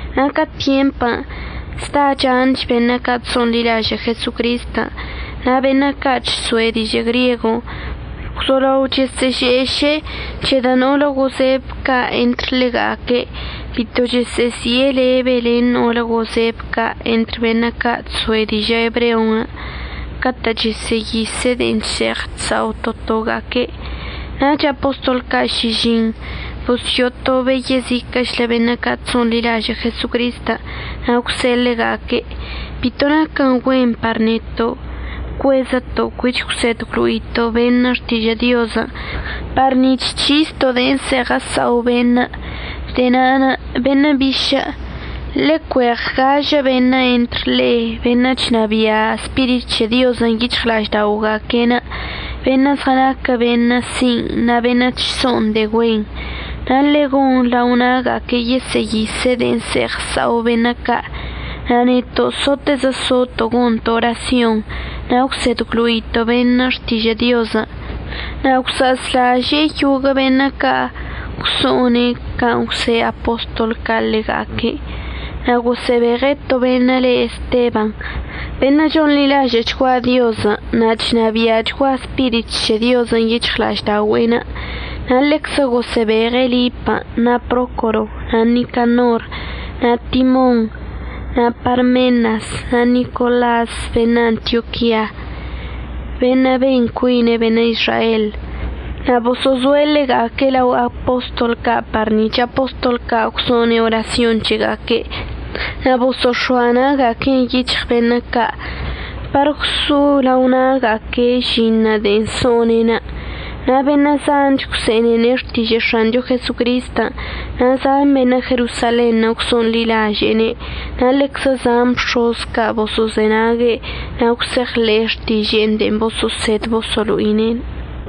Na' ca tyempən' zda chanch beṉə' ca' chso'onḻilažə' Jesocristən' na' beṉə' ca' chso'e dižə' griego gwzolao chəsə'əže'eše'e c̱hedə' no'olə gozeb ca' entr ḻega'aque' bito chəsə'əzi'e lebe len no'olə gozeb ca' entr beṉə' ca' chso'e dižə' ebreo catə' chəsə'əyise' de'en chse'eɉ chsa'o to toga'aque'. Nach apostol ca' šižiṉ bosyo'otobe' yeziquə'əchlə beṉə' ca' chso'onḻilažə' Jesocristən' na' gwse'e ḻega'aque': ―Bito naquən güen par neto' cuezəto' cuich əgwsed əgwlo'ito' beṉə' xtižə' Diozən' par nic̱h c̱histo' de'en əse'eɉ əsa'o beṉə'. De'e na'anə' beṉə' bišə', ḻecueɉ gažə beṉə' entr le'e, beṉə' chnabia' Spirit c̱he Diozən' yic̱hɉla'ažda'oga'aque'enə', beṉə' zɉənaquə beṉə' sin' na' beṉə' chso'on de'e güenṉə', na' ḻe'e gon lao na'aga'aque' yesə'əyise' de'en əse'eɉ əsa'o beṉə' ca'. Na' neto' sotezə soto' gonto' orasyonṉə' na' əgwsed əgwlo'ito' beṉə' xtižə' Diozən'. Na' gwsa'azlažə' yoguə' beṉə' ca' gwso'one' can' gwse' apostol ca' ḻega'aque', na' gosə'əbeɉe' to beṉə' le Esteban, beṉə' chonḻilažə'əchgua Diozən' na' chnabi'achgua Spirit c̱he Diozən' yic̱hɉla'aždaogüe'enə'. Na' ḻeczə gosə'əbeɉe' Lip na' Procoro na' Nicanor na' Timon, na' Parmenas na' Nicolas beṉə' Antioquia, beṉə' ben cuine' beṉə' Izrael. Na' boso'ozoe' ḻega'aque' lao apostol ca' par nic̱h apostol ca' gwso'one' orasyon c̱hega'aque' na' boso'ox̱oa na'aga'aque'enə' yic̱hɉ beṉə' ca' par gwso'o lao na'aga'aque'enə' žinṉə' de'en so'one'enə'. Na' beṉə' zanch gwse'enene' xtižə' X̱ancho Jesocristən', na' zan beṉə' Jerosalenṉə' gwso'onḻilaže'ene' na' ḻeczə zan bx̱oz ca' boso'ozenague' na' gwse'eɉḻe'e xtiže'enə' de'en boso'osed boso'olo'ine'.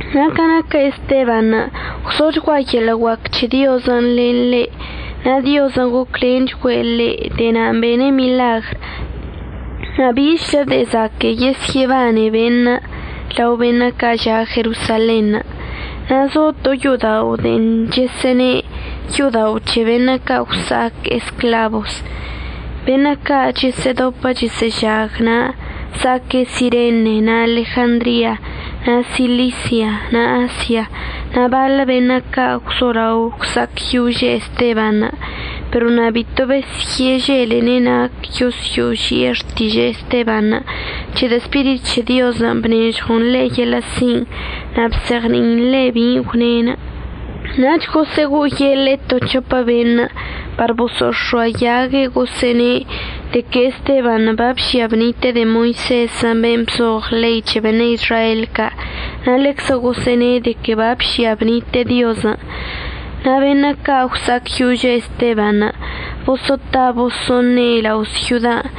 Na' ca naquə Estebanṉə' gwzochgua yeḻə' guac c̱he Diozən' len ḻe' na' Diozən' goclenchgüe' ḻe'. De'e na'anə' bene' miḻagr na' bichlə de'e zaquə' yesyə'əbane beṉə' lao beṉə' ca' ža' Jerosalenṉə'. Na' zo to yo'oda'onə' de'en chəsə'əne' “Yo'odao' c̱he Beṉə' ca' Gwsa'ac Esclabos”. Beṉə' ca' chəsə'ədopə chəsə'əžag na' za'aque' Sirene na' Alejandria, na' Silisia na' Asia, na' baḻə beṉə' ca' gwzolao gwsa'acyože' Estebanṉə'. Pero na' bito besyə'əželene' nac yosyo'oži'e xtižə' Estebanṉə' c̱hedə' Spirit c̱he Diozən' bnežɉon ḻe' yeḻə' sin' na' bzeɉni'in ḻe' bin' gwne'. Nach gosə'əgo'oyeḻe'e to c̱hopə beṉə' par boso'ox̱oayague' gosə'əne' de que Estebanṉə' babžia bnite'e de'e Moisezən' ben' bzoɉ ḻei c̱he beṉə' Izrael ca' na' ḻeczə gosə'əne' de que babžia bnite'e Diozən'. Na' beṉə' ca' gwsa'acyožə Estebanṉə' boso'ota boso'oṉe' beṉə' lao syodan'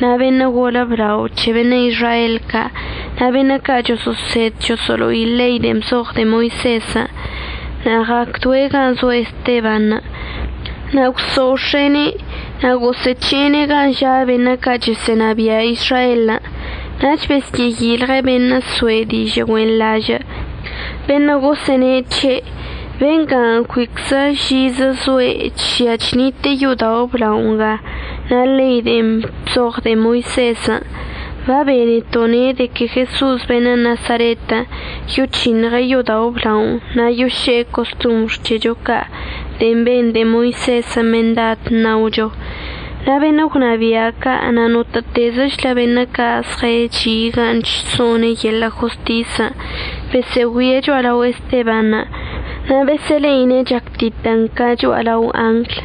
na' beṉə' golə blao c̱he beṉə' Izrael ca' na' beṉə' ca' choso'osed choso'olo'i ḻei de'en bzoɉ de'e Moisezən'. Na' ɉa'acdoe' gan' zo Estebanṉə' na' gwso'ox̱e'ene' na' gosə'əc̱he'ene' gan' ža' beṉə' ca' chəsə'ənabia' Izraelən'. Nach besyə'əyilɉe' beṉə' soe' dižə' güenḻažə' beṉə' gosə'əne' c̱he': ―Benga cuiczə žizə zoe' chžia chnite'e yo'odao' əblao nga na' ḻei de'en bzoɉ de'e Moisezən'. Babeneto' ne' de que Jeso'os beṉə' Nasaretən' yoc̱hiṉɉe' yo'odao' əblaonə' na' yoše'e costombr c̱hecho ca' de'en ben de'e Moisezən' mendad ṉaocho. Na' beṉə' gwnabia' ca' na' notə'ətezəchlə beṉə' ca' zɉəchi' gan' chso'one' yeḻə' jostisən' besə'əgüie' cho'alao Estebanṉə' na' besə'əle'ine' chactitən ca cho'alao angl.